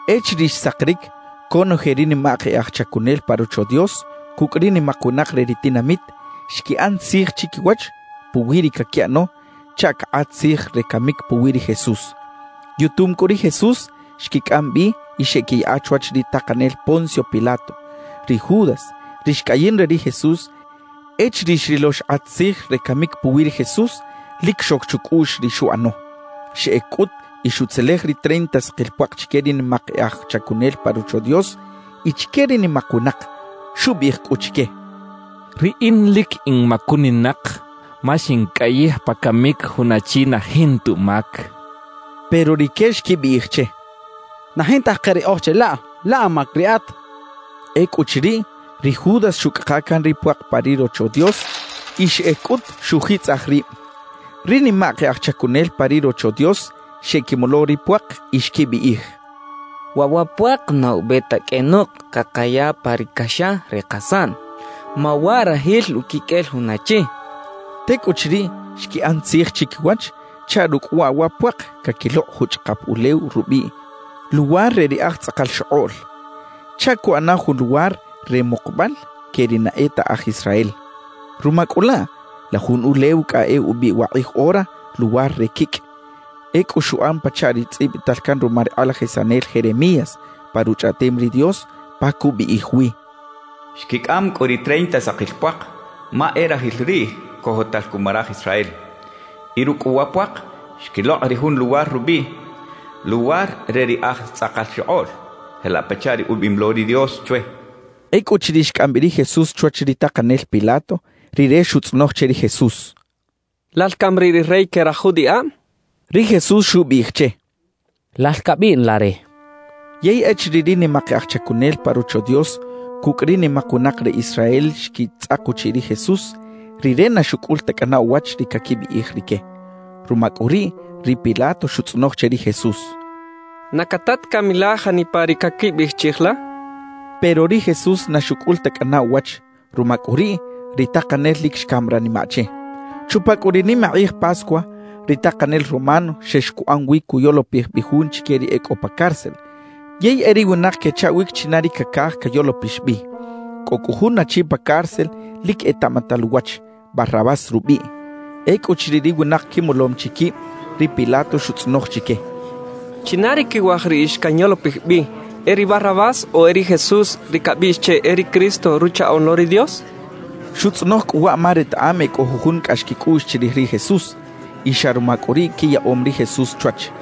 Echiriꞌ xsakiric, conoje ri nimak e aj chacunel pa Rocho Dios cucꞌ ri nimak winak re ri tinamit, xquiꞌan tzij chiquiwach puwi ri caquiꞌano chaꞌ cakꞌat tzij re camic puwi ri Jesús. Yutum cꞌu ri Jesús, xquicꞌam bi y xeꞌquiyaꞌa chwach ri takanel Poncio Pilato. Ri Judas ri xcꞌayin re ri Jesús, echiriꞌ xrilo xkꞌat tzij re camic puwi ri Jesús, lic xoc chucꞌuꞌx ri xuꞌano. Xeꞌec cꞌut y xutzelej ri treinta sakil puak chique ri nimak e aj chacunel pa Rocho Dios y chique ri nimak winak. Xubiꞌij cꞌu chique: —Riꞌin lic in macuninak, ma xincꞌayij pa camic jun achi na jinta umac —xchaꞌ. Pero rique xquibiꞌij che: —Na jinta ke riꞌoj che laꞌ; laꞌ amac riꞌat —xechaꞌ. Ecꞌuchiriꞌ, ri Judas xuꞌcꞌaka can ri puak pa ri Rocho Dios y xeꞌec cꞌut xuꞌjitzꞌaj rib. Ri nimak e aj chacunel pa ri Rocho Dios xeꞌquimolo ri puak y xquibiꞌij: «Waꞌ wa puak na ube ta qꞌuenok cakaya pa ri caxa re kasaꞌn, ma waꞌ rajil uquiqꞌuel jun achi» xechaꞌ. Tecꞌuchiriꞌ, xquiꞌan tzij chiquiwach chaꞌ rucꞌ waꞌ wa puak caquilokꞌ juchꞌakap ulew rubiꞌ “Luwar re ri aj tzꞌakal xokꞌoꞌl”, chaꞌ cuꞌana jun luwar re mukubal que ri na e ta aj Israel. Ruma cꞌu laꞌ, la jun ulew cꞌa e ubiꞌ wakꞌij ora “Luwar re quicꞌ”. Ecꞌu xuꞌan pachaꞌ ri tzꞌibital can ruma ri kꞌalajisanel Jeremías pa Ruchꞌaꞌtem ri Dios, pa cubiꞌij wi: Xquicꞌam cꞌu ri treinta sakil puak, ma e rajil riꞌ cojotal cuma raj Israel. Y rucꞌ cꞌu wa puak, xquilokꞌ ri jun luwar rubiꞌ “Luwar re ri aj tzꞌakal xokꞌoꞌl”, jelaꞌ pachaꞌ ri ubiꞌim lo ri Dios chwe. Ecꞌuchiriꞌ xcꞌam bi ri Jesús chwach ri takanel Pilato, rire xutzꞌonoj che ri Jesús: —¿Lal cami riꞌ ri rey que raj judiꞌab? —xchaꞌ. Ri Jesús xubiꞌij che: —Lal cabiꞌn la re —xchaꞌ. Yey echiriꞌ ri nimak e aj chacunel pa Rocho Dios cucꞌ ri nimak winak re Israel xquitzꞌak uchiꞌ ri Jesús, Rire na xucꞌul ta cꞌana uwach ri caquibiꞌij rique. Ruma cꞌu riꞌ, ri Pilato xutzꞌonoj che ri Jesús: —¿Na cata ta cami la janipa ri caquibiꞌij chiꞌij la? —xchaꞌ. Pero ri Jesús na xucꞌul ta cꞌana uwach; ruma cꞌu riꞌ, ri takanel lic xcam ranimaꞌ che. Chupa cꞌu ri nimakꞌij Pascua, ri takanel romano xex cuꞌan wi cuyolopij bi jun chique ri e cꞌo pa cárcel, yey e ri winak quechaꞌwic china ri cacaj cayolopix bi. Cꞌo cꞌu jun achi pa cárcel lic etaꞌmatal uwach, Barrabás rubiꞌ. Ecꞌuchiriꞌ ri winak quimolom chi quib, ri Pilato xutzꞌonoj chique: —¿China ri quiwaj riꞌix canyolopij bi, e ri Barrabás o e ri Jesús, ri cabiꞌx che “e ri Cristo”, Ruchaꞌoꞌn lo ri Dios? —xchaꞌ. Xutzꞌonoj cꞌu waꞌ ma retaꞌam e cꞌo jujun cꞌax quicꞌuꞌx chirij ri Jesús, y xa ruma cꞌu riꞌ quiyaꞌom ri Jesús chwach.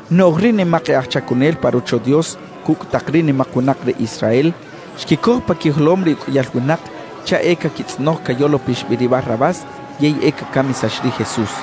Noꞌj ri nimak e aj chacunel pa Rocho Dios cucꞌ tak ri nimak winak re Israel xquicoj pa quijolom ri uqꞌuiyal winak chaꞌ e caquitzꞌonoj cayolopix bi ri Barrabás yey e cacamisax ri Jesús.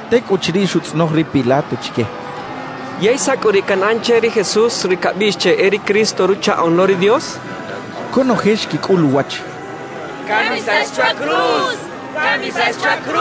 Tecꞌuchiriꞌ, xutzꞌonoj ri Pilato chique: —¿Yey saꞌ cꞌu riꞌ canꞌan che ri Jesús, ri cabiꞌx che “e ri Cristo”, Ruchaꞌoꞌn lo ri Dios? —xchaꞌ. Conoje xquicꞌul uwach: —¡Camisax chwa cruz! —xechaꞌ.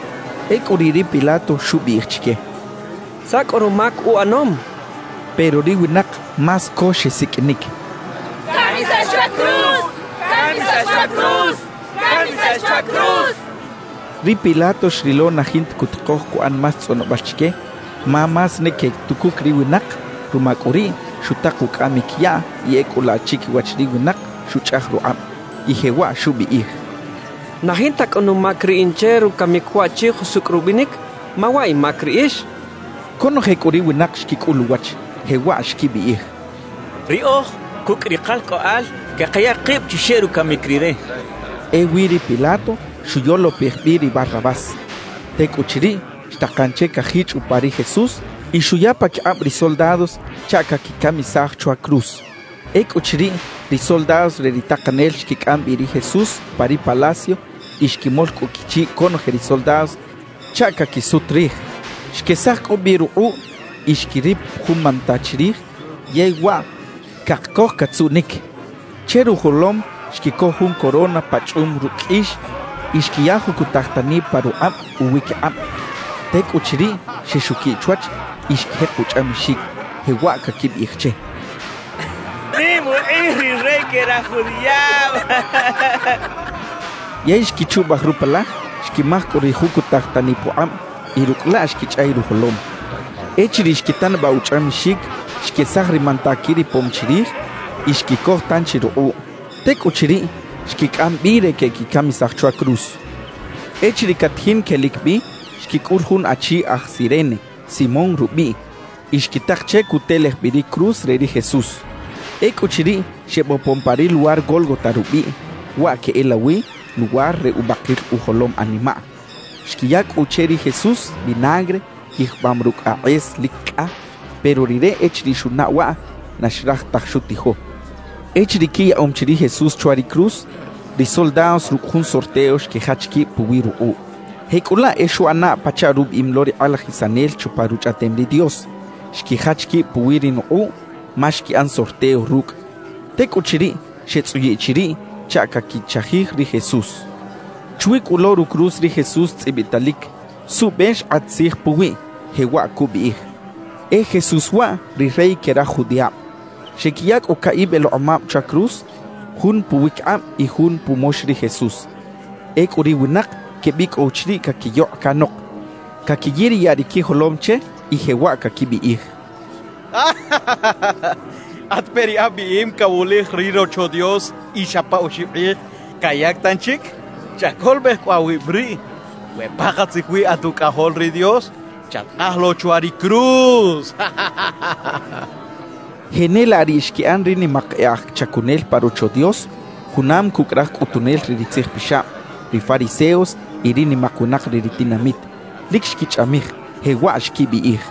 Ecꞌu riꞌ ri Pilato xubiꞌij chique: —¿Saꞌ cꞌu rumac uꞌanom? —xchaꞌ. Pero ri winak más co xesiqꞌuinic: —¡Camisax chwa cruz! —xechaꞌ. Ri Pilato xrilo na jinta cutikoj cuꞌan más tzꞌonobal chique ma más ne quetucuc ri winak; ruma cꞌu riꞌ, xutak ucꞌamic yaꞌ y ecꞌu laꞌ chiquiwach ri winak xuchꞌaj rukꞌab, y jewaꞌ xubiꞌij: —Na jinta cꞌu numac riꞌin che rucamic waꞌchi jusucꞌ rubinic, ma waꞌ imac riꞌix —xchaꞌ. Conoje cꞌu ri winak xquicꞌul uwach, jewaꞌ xquibiꞌij: —Riꞌoj cucꞌ ri kalcꞌoꞌal cakaya kib chuxeꞌ rucamic rire —xechaꞌ. Ewi ri Pilato xuyolopij bi ri Barrabás. Tecꞌuchiriꞌ, xtakan che cajichꞌ upa ri Jesús y xuya paquikꞌab ri soldados chaꞌ caquicamisaj chwa cruz. Ecꞌuchiriꞌ, ri soldados re ri takanel xquicꞌam bi ri Jesús pa ri palacio y xquimol cꞌu quichiꞌ conoje ri soldados chaꞌ caquisut rij. Xquesaj cꞌu bi rukꞌuꞌ y xquirip jun manta chirij yey waꞌ cakcoj catzuꞌnic. Che rujolom xquicoj jun corona pachꞌum rucꞌ qꞌuix y xquiya jucutaj tani pa rukꞌab uwiquikꞌab. Tecꞌuchiriꞌ, xexuquiꞌ chwach y xquijek uchꞌamixic, jewaꞌ caquibiꞌij che: —¡Nim ukꞌij ri rey que raj judiꞌab! —quechaꞌ. Yey xquichubaj rupalaj, xquimaj cꞌu ri jucutaj tani pukꞌab y rucꞌ laꞌ xquichꞌay rujolom. Echiriꞌ xquitanabaꞌ uchꞌamixic, xquesaj ri manta quiripom chirij y xquicoj tanchi rukꞌuꞌ. Tecꞌuchiriꞌ, xquicꞌam bi re queꞌquicamisaj chwa cruz. Echiriꞌ catajin quelic bi, xquicꞌul jun achi aj Cirene, Simón rubiꞌ, y xquitak che cutelej bi ri cruz re ri Jesús. Ecꞌuchiriꞌ, xebopon pa ri luwar Gólgota rubiꞌ, waꞌ queꞌelawi “luwar re ubakil ujolom animaꞌ”. Xquiya cꞌu che ri Jesús vinagre yijbam rucꞌ akꞌes lic cꞌa; pero Rire echiriꞌ xunaꞌ waꞌ, na xraj taj xutijo. Echiriꞌ quiyaꞌom chi ri Jesús chwa ri cruz, ri soldados rucꞌ jun sorteo xquijach quib puwi rukꞌuꞌ. Jecꞌulaꞌ e xuꞌana pachaꞌ rubiꞌim lo ri kꞌalajisanel chupa Ruchꞌaꞌtem ri Dios: Xquijach quib puwi ri nukꞌuꞌ, ma xquiꞌan sorteo rucꞌ. Tecꞌuchiriꞌ, xetzꞌuyiꞌ chiriꞌ chaꞌ caquichajij ri Jesús. Chwi cꞌu lo rucruz ri Jesús tzꞌibitalic suꞌbe xkꞌat tzij puwiꞌ, jewaꞌ cubiꞌij: «E JESÚS WAꞌ, RI REY QUE RAJ JUDIꞌAB.» Xequiya cꞌu caꞌib elekꞌomab chwa cruz, jun puwiquikꞌab y jun pumox ri Jesús. Ecꞌu ri winak quebicꞌow chiriꞌ caquiyokꞌ canok, caquiyiriyaꞌ ri quijolom che, y jewaꞌ caquibiꞌij: —At peꞌ ri abiꞌim cawulij ri Rocho Dios y xa pa oxib kꞌij cayac tanchic; chacolobej cꞌu awib riꞌ. We pakatzij wi at Ucꞌajol ri Dios, chatkaj lo chwa ri cruz —quechaꞌ. Jenelaꞌ riꞌ xquiꞌan ri nimak e aj chacunel pa Rocho Dios junam cucꞌ raj cꞌutunel re ri tzijpixab, ri fariseos y ri nimak winak re ri tinamit; lic xquichꞌamij, jewaꞌ xquibiꞌij: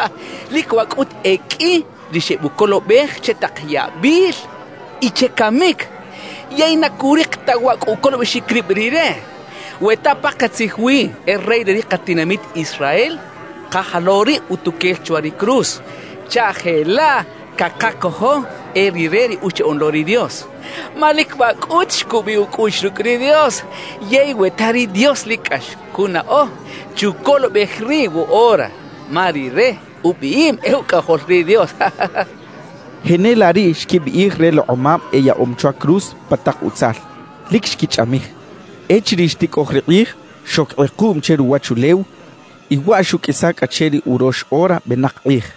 —Lic waꞌ cꞌut e qꞌui ri xebucolobej che tak yabil y che camic, yey na curik ta waꞌ cꞌu ucolobexic rib rire. We ta pakatzij wi e Rey re ri katinamit Israel, kaja lo riꞌ utuquel chwa ri cruz chaꞌ jelaꞌ cakacojo e rire ri Uchaꞌoꞌn lo ri Dios. Ma lic waꞌ cꞌut xcubiꞌ ucꞌuꞌx rucꞌ ri Dios. Yey we ta ri Dios lic cꞌax cunaꞌo, chucolobej riꞌ woꞌora, ma rire ubiꞌim e Ucꞌajol ri Dios —xechaꞌ. Jenelaꞌ riꞌ xquibiꞌij relekꞌomab eyaꞌom chwa cruz pa tak utzal, lic xquichꞌamij. Echiriꞌ xticꞌoj ri kꞌij, xoc kꞌekuꞌm che ruwachulew y waꞌ xuꞌqꞌuisa cꞌa che ri urox ora benak kꞌij.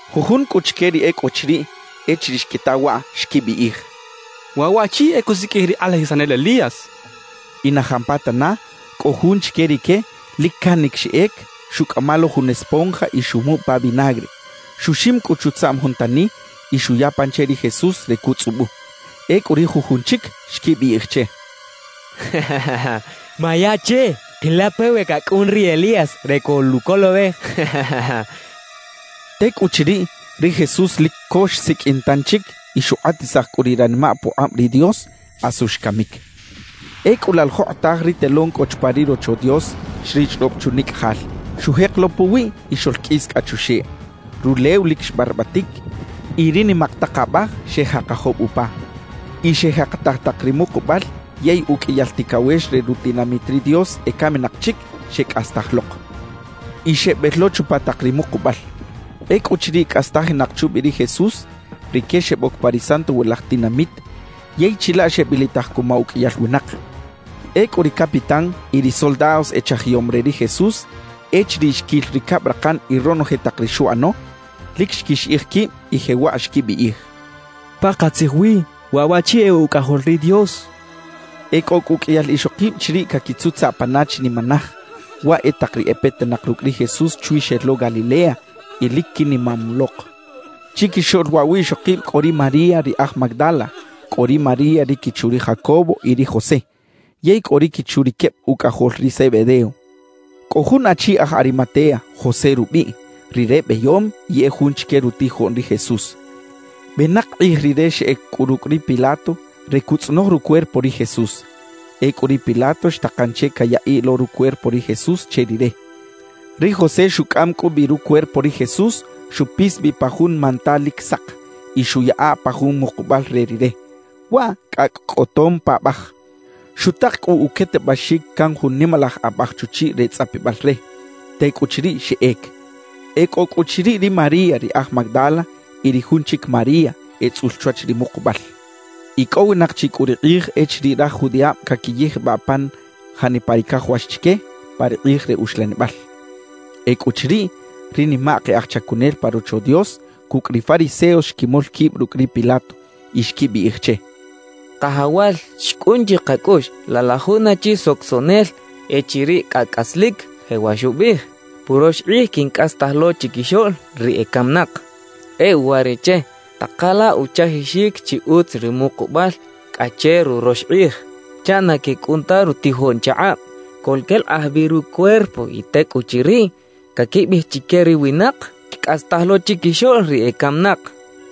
Jujun cꞌu chique ri e cꞌo chiriꞌ, echiriꞌ xquita waꞌ, xquibiꞌij: —Waꞌ waꞌchi e cusiqꞌuij ri kꞌalajisanel Elías —xechaꞌ. Y na jampatana, cꞌo jun chique rique lic canic xeꞌec, xuꞌcꞌama lo jun esponja y xumuꞌ pa vinagre. Xuxim cꞌu chutzaꞌm jun tani y xuya pan che ri Jesús re cutzꞌubu. Ecꞌu ri jujun chic xquibiꞌij che: —Maya che, kila peꞌ we cacꞌun ri Elías re coluꞌcolobej —xechaꞌ. Tecꞌuchiriꞌ, ri Jesús lic co xsiqꞌuin tanchic y xukꞌatisaj cꞌu ri ranimaꞌ pukꞌab ri Dios, asu xcamic. Ecꞌu laꞌ la jokꞌotaj ri telón cꞌo chupa ri Rocho Dios xrichꞌrob chunicꞌajal; xujek lo puwiꞌ y xoꞌlqꞌuis cꞌa chuxeꞌ. Rulew lic xbarbatic y ri nimak tak abaj xejakajob upa. Y xejakataj tak ri mukubal yey uqꞌuiyal ticawex re rutinamit ri Dios ecaminak chic, xecꞌastaj lok y xebel lo chupa tak ri mukubal. Ecꞌuchiriꞌ cꞌastajinak chubi ri Jesús, rique xeboc pa ri santowilaj tinamit yey chilaꞌ xebilitaj cuma uqꞌuiyal winak. Ecꞌu ri capitán y ri soldados echajiyom re ri Jesús, echiriꞌ xquil ri cabrakan y ronoje tak ri xuꞌano, lic xquixiꞌij quib y jewaꞌ xquibiꞌij: —¡Pakatzij wi, waꞌ waꞌchi e Ucꞌajol ri Dios! —xechaꞌ. E cꞌo cꞌu uqꞌuiyal ixokib chiriꞌ caquitzutzaꞌ pana chinimanaj; waꞌ e tak ri e petinak rucꞌ ri Jesús chwi xel lo Galilea y lic quinimam lok. Chiquixoꞌl waꞌ wiꞌxokib cꞌo ri María ri aj Magdala, cꞌo ri María ri quichu ri Jacobo y ri José, yey cꞌo ri quichu ri queb ucꞌajol ri Zebedeo. Cꞌo jun achi aj Arimatea, José rubiꞌ; rire beyom y e jun chique rutijoꞌn ri Jesús. Benak kꞌij rire xeꞌec cꞌu rucꞌ ri Pilato re cuꞌtzꞌonoj rucuerpo ri Jesús. Ecꞌu ri Pilato xtakan che cayaꞌiꞌ lo rucuerpo ri Jesús che rire. Ri José xucꞌam cꞌu bi rucuerpo ri Jesús, xupis bi pa jun manta lic sak y xuꞌyaꞌa pa jun mukubal re rire, waꞌ cꞌacꞌ cꞌotom paꞌbaj. Xutak cꞌu uquetebaxic can jun nimalaj abaj chuchiꞌ re tzꞌapibal re; tecꞌuchiriꞌ, xeꞌec. E cꞌo cꞌu chiriꞌ ri María ri aj Magdala y ri jun chic María, etzꞌul chwach ri mukubal. Icꞌowinak chi cꞌu ri kꞌij echiriꞌ raj judiꞌab caquiyijbaꞌ pan janipa ri cajawax chique pa ri kꞌij re uxlanibal. Ecꞌuchiriꞌ, ri nimak e aj chacunel pa Rocho Dios cucꞌ ri fariseos xquimol quib rucꞌ ri Pilato y xquibiꞌij che: —Kajawal, xcꞌun chikacꞌuꞌx, laꞌ la jun achi socosoꞌnel echiriꞌ cꞌa cꞌaslic jewaꞌ xubiꞌij: “Purox kꞌij quincꞌastaj lo chiquixoꞌl ri ecaminak.” E uwariꞌche, taka la uchajixic chi utz ri mukubal cꞌa che rurox kꞌij, chaꞌ na quecꞌun ta rutijoꞌn chakꞌab, coꞌlquelakꞌaj bi rucuerpo y tecꞌuchiriꞌ, caquibiꞌij chique ri winak: “Xcꞌastaj lo chiquixoꞌl ri ecaminak.”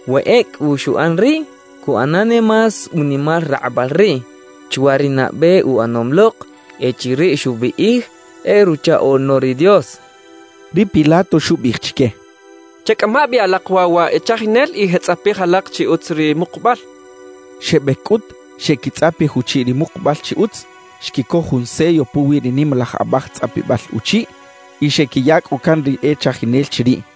We ecꞌu xuꞌan riꞌ, cuꞌana ne más unimal rakꞌubal riꞌ chwa ri nabe uꞌanom lok echiriꞌ xubiꞌij e Ruchaꞌoꞌn lo ri Dios —xechaꞌ. Ri Pilato xubiꞌij chique: —Checꞌama bi alak waꞌ wa e chajinel y jeꞌtzꞌapij alak chi utz ri mukubal —xchaꞌ. Xebec cꞌut, xeꞌquitzꞌapij uchiꞌ ri mukubal chi utz, xquicoj jun sello puwi ri nimalaj abaj tzꞌapibal uchiꞌ y xequiya cꞌu can ri e chajinel chiriꞌ.